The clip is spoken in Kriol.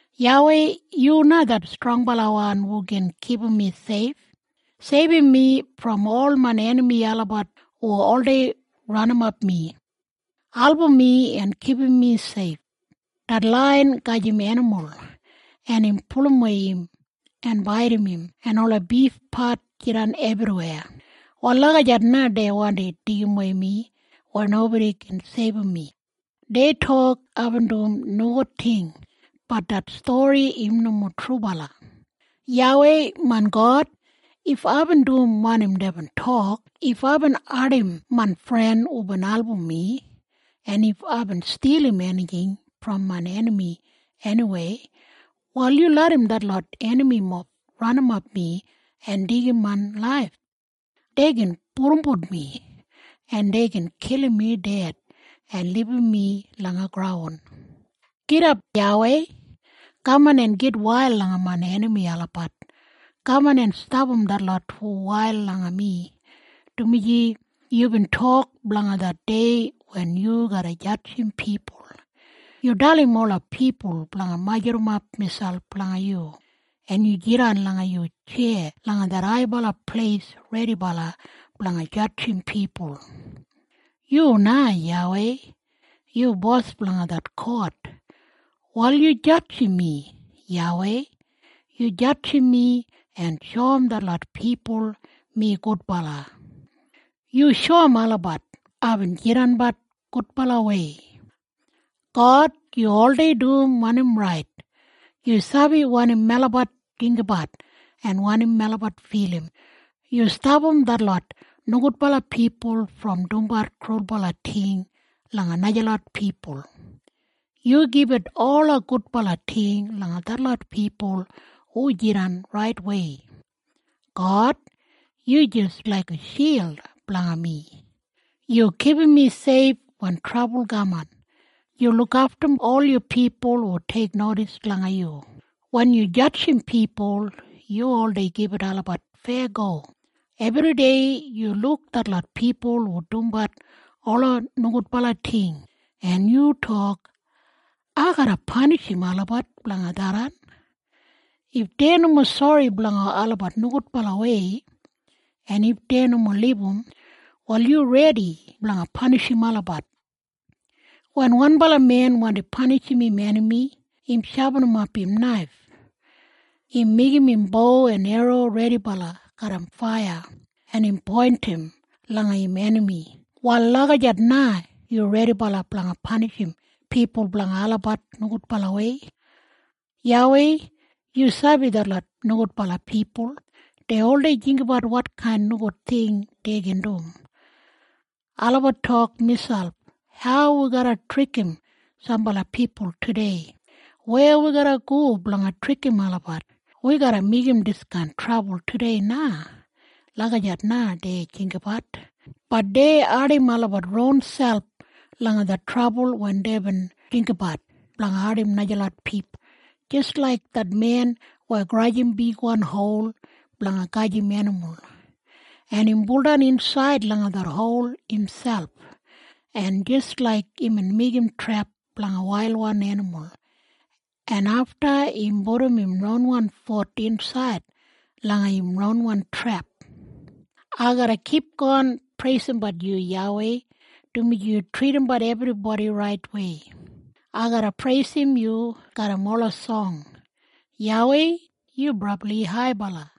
YAWEI, yu na det strongbalawan hu gin kipum mi seif. Seibum mi brom ol main enami olabat hu oldei ranimap mi. Album mi en kipum mi seif. Det laiyan gajim enimul, en im pulumwei im en baidim im, en ola bifpat jidan ebriweya. Wal lagijat na dei wandi deigimwei mi weya nobodi gin seibum mi. Dei tok aibin dum nogud ting, bat det stori im nomo trubala. YAWEI, main God, if aibin dum wanim deibin tok, if aibin ardim main fren hubin album mi, en if aibin stilim enijing brom main enami eniweya, wal yu larram detlot enamimob ranimap mi en deigim main laif. Dei gin pudumbut mi, en dei gin kilim mi ded, en libum mi langa graun. Gidap, YAWEI! Kaman en gitwail langa main enami olabat! Kaman en stapam detlot hu wail langa mi, dumaji yubin tok blanga det dei wen yu garra jadjim pipul. Yu dalim ola pipul blanga majurrumap miselp langa yu, en yu jidan langa yu tjeya langa det haibala pleis redibala blanga jadjim pipul. Yu na, YAWEI, yu bos blanga det kot. Wal yu jadjim mi, YAWEI! Yu jadjim mi en shoum detlot pipul mi gudbala. Yu shoum olabat aibin jidanbat gudbalawei. God, yu oldei dum wanim rait. Yu sabi wanim melabat jinggabat en wanim melabat filim. Yu stapam detlot nogudbala pipul brom dumbat krulbala ting langa najalot pipul. Yu gibit ola gudbala ting langa detlot pipul hu jidan raitwei. God, yu jis laiga shild blanga mi. Yu kipum mi seif wen trabul kaman, Yu lukaftum ol yu pipul hu teiknodis langa yu. Wen yu jadjim pipul yu oldei gibit olabat feyago. Ebridei yu luk detlot pipul hu dumbat ola nogudbala ting, en yu tok, “Ai garra panishim olabat blanga tharran.” If dei nomo sori blanga olabat nogudbalawei, en if dei nomo libum, wal yu redi blanga panishim olabat. Wen wanbala men wandi panishim im enami, im shapinimap im naif. Im meigim im bo en erro redibala garram faiya, en im poindim langa im enami. Wal lagijat na yu redibala blanga panishim pipul blanga olabat nogudbalawei. YAWEI yu sabi detlot nogudbala pipul. Dei oldei jinggabat wotkain nogud ting dei gin dum. Olabat tok miselp, “Hau wi garra trikim sambala pipul tudei?” “Weya wi garra go blanga trikim olabat?” “Wi garra meigim diskain trabul tudei na.” Lagijat na dei jinggabat. Bat dei ardim olabat ronselp langa det trabul wen deibin jinggabat blanga ardim najalot pipul, jis laik det men weya grajim bigwan hol blanga gajim enimul, en im buldan insaid langa det hol imselp, en jis laik imbin meigim trep blanga wailwan enimul, en afta im pudum im ronwan fut insaid langa im ronwan trep. Ai garra kipgon preisimbat yu, YAWEI, dumaji yu tridimbat ebribodi raitwei. Ai garra preisim yu garram ola song. YAWEI, yu brabli haibala.